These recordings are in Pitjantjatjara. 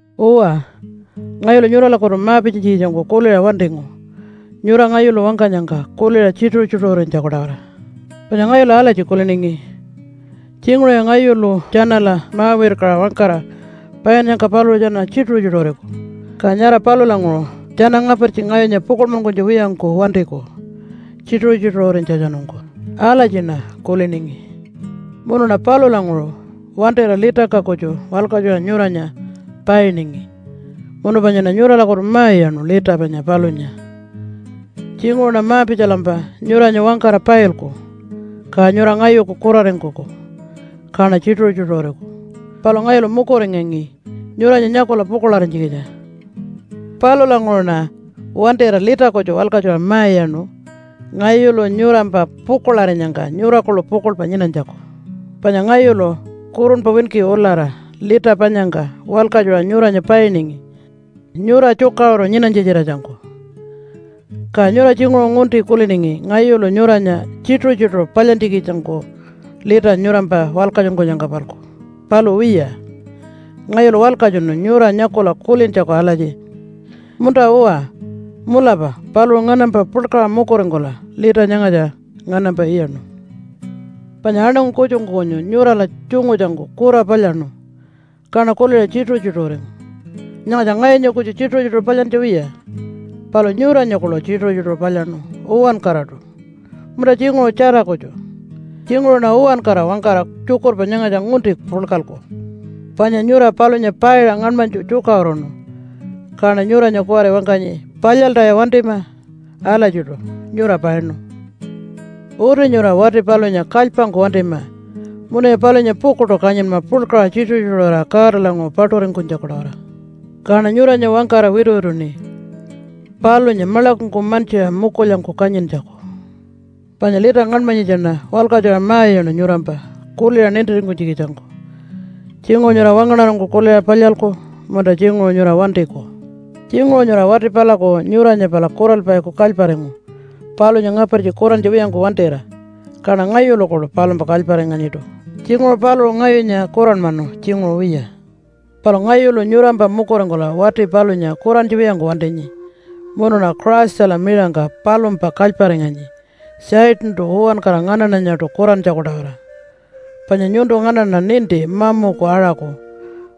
Uwa, ngayulu nyuralakutu ma-pitjanytjikitjangku kuliṟa wantingu nyura ngayulu wangkanyangka kuliṟa tjituṟu-tjituṟurinytjaku-tawara. Panya ngayulu alatji kuliningi, “Tjinguṟuya ngayulu tjanala ma-wirkaṟa wangkara painnyangka paluṟu tjana tjituṟu-tjituṟuriku, ka nyara palulanguṟu tjana ngapartji ngayunya pukuḻmankunytja wiyangku wantiku tjituṟu-tjituṟurinytjatjanungku.” Alatjiṉa kuliningi. Munuṉa palulanguṟu wantira litangka kutju walkatjuṟa nyuranya painingi munu panyaṉa nyuralakutu ma-iyaṉu lita panya palunya. Tjinguṟuṉa ma-pitjalampa nyuranya wangkara pailku ka nyura ngayuku kuraringkuku kaṉa tjituṟu-tjituṟuriku, palu ngayulu mukuringangi nyuranya nyakula pukuḻarinytjikitja. Palulanguṟuṉa wantira lita kutju walkatjuṟa ma-iyaṉu ngayulu nyurampa pukuḻarinyangka nyura kuḻu pukuḻpa nyinanytjaku. Panya ngayulu kurunpa winki ulara lita panyangka walkatjuṟa nyuranya painingi nyura tjukaṟuru nyinanytja-tjiratjangku. Ka nyura tjinguṟu ngunti kuliningi ngayulu nyuranya tjituṟu-tjituṟu palyantjikitjangku lita nyurampa walkatjunkunyangka-palku. Palu wiya, ngayulu walkatjunu nyura nyakula kulintjaku alatji, “Munta-uwa, mulapa paluṟu nganampa puḻkaṟa mukuringkula lita nyangatja nganampa iyaṉu.” Panya aṉangu kutjungku kunyu nyurala tjungutjangku kura palyaṉu, kaṉa kuliṟa tjituṟu-tjituṟuringu. Nyangatja ngayunya kutju tjituṟu-tjituṟu palyantja wiya, palu nyuranya kuḻu tjituṟu-tjituṟu palyaṉu uwankaraṯu, munta tjinguṟu tjara kutju. (Tjinguṟuṉa uwankara wangkara tjukurpa nyangatja ngunti puḻkalku.) Panya nyura palunya paiṟa ngaṉmanytju tjukaṟuruṉu. Kaṉa nyuranya kuwari wangkanyi, “Palyaltaya wantima! Alatjiṯu nyura painu.” Uti nyura wati palunya kalypangku wantima munuya palunya pukuḻṯu kanyinma puḻkaṟa tjituṟu-tjituṟurira Godalanguṟu paṯuringkunytjaku-tawara. Kaṉa nyuranya wangkara wituwituṉi palunya maḻakungku mantjiṟa mukulyangku kanyintjaku. Panya lita ngaṉmanyitjaṉa walkatjuṟa ma-iyaṉu nyurampa kuliṟa nintiringkunytjikitjangku, tjinguṟu nyura wangaṉarangku kuliṟa palyalku munta tjinguṟu nyura wantiku. Tjinguṟu nyura wati palaku nyuranya pala kuralpaiku kalyparingu palunya ngapartji kurantja wiyangku wantira, kaṉa ngayulu kuḻu palumpa kalyparinganyiṯu. Tjinguṟu paluṟu ngayunya kuranmanu, tjinguṟu wiya. Palu ngayulu nyurampa mukuringkula wati palunya kurantja wiyangku wantinyi munuṉa Christala miṟangka palumpa kalyparinganyi Satantu uwankara nganaṉanyaṯu kurantjaku-tawara, panya nyuntu nganaṉa ninti mamuku aṟaku,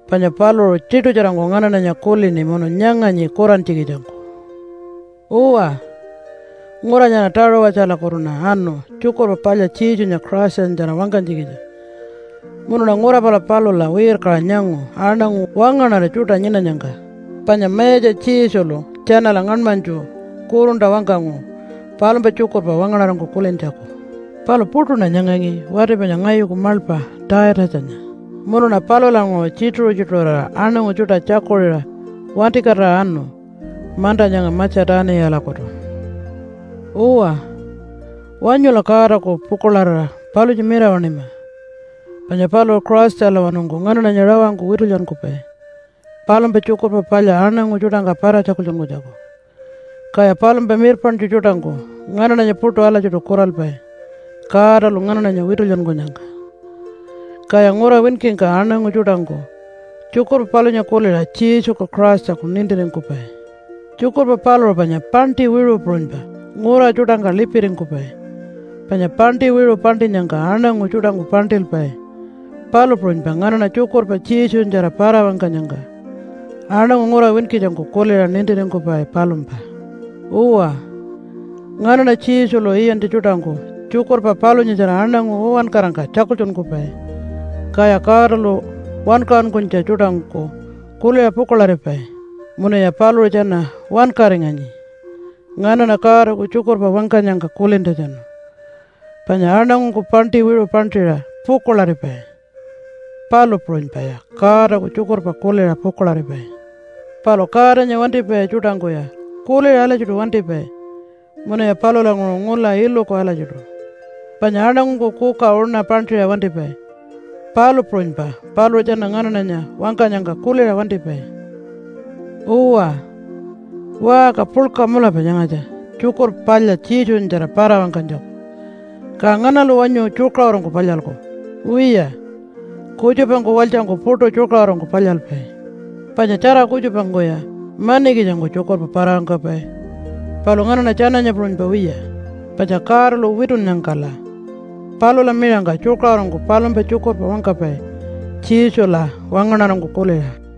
panya paluṟu tiṯutjarangku nganaṉanya kulini munu nyanganyi kurantjikitjangku. Uwa, ngura nyara Taṟuwatjalakutuṉa anu Tjukurpa Palya Jesunya Christanyatjara wangkanytjikitja munuṉa ngura pala palula wirkaṟa nyangu aṉangu wangaṉara tjuṯa nyinanyangka, panya Mayatja Jesulu tjanala ngaṉmanytju kurunta wangkangu palumpa tjukurpa wangaṉarangku kulintjaku. Palu puṯuṉa nyangangi wati panya ngayuku maḻpa Taitatjanya. Munuṉa palulanguṟu tjituṟu-tjituṟurira aṉangu tjuṯa tjakuṟiṟa wantikatira anu manta nyanga Matja-tuniyalakutu. Uwa, wanyula Godaku pukuḻarira palunya mirawaṉima, panya paluṟu Christalawanungku nganaṉanya rawangku witulyankupai palumpa Tjukurpa Palya aṉangu tjuṯangka para-tjakultjunkunytjaku, kaya palumpa mirpaṉtju tjuṯangku nganaṉanya puṯu alatjiṯu kuralpai Godalu nganaṉanya witulyankunyangka. Kaya ngura winkingka aṉangu tjuṯangku tjukurpa palunya kuliṟa Jesuku Christaku nintiringkupai. Tjukurpa paluṟu panya paṉṯi wiṟu puṟunypa ngura tjuṯangka lipiringkupai. Panya paṉṯi wiṟu paṉṯinyangka aṉangu tjuṯangku paṉṯilpai, palu puṟunypa nganaṉa tjukurpa Jesunyatjara para-wangkanyangka aṉangu ngura winkitjangku kuliṟa nintiringkupai palumpa. Uwa, nganaṉa Jesulu iyantja tjuṯangku tjukurpa palunyatjara aṉangu uwankarangka tjakultjunkupai, kaya Godalu wankaṟunkunytja tjuṯangku kuliṟa pukuḻaripai munuya paluṟu tjana wankaringanyi nganaṉa Godaku tjukurpa wangkanyangka kulintjatjanu. Panya aṉangungku paṉṯi wiṟu paṉṯiṟa pukuḻaripai, palu puṟunypaya Godaku tjukurpa kuliṟa pukuḻaripai. Palu Godanya wantipai tjuṯangkuya kuliṟa alatjiṯu wantipai munuya palulanguṟu ngula iluku alatjiṯu. Panya aṉangungku kuka uṉa paṉṯiṟa wantipai, palu puṟunypa paluṟu tjana nganaṉanya wangkanyangka kuliṟa wantipai. Uwa, waṟka puḻka mulapa nyangatja Tjukurpa Palya Jesunyatjara para-wangkanytjaku, ka nganalu wanyu tjukaṟurungku palyalku? Wiya, kutjupangku walytjangku puṯu tjukaṟurungku palyalpai. Panya tjara kutjupangkuya manikitjangku tjukurpa para-wangkapai, palu nganaṉa tjananya puṟunypa wiya, panya Godalu witunnyangkala palula miṟangka tjukaṟurungku palumpa tjukurpa wangkapai Jesula wangaṉarangku kuliṟa.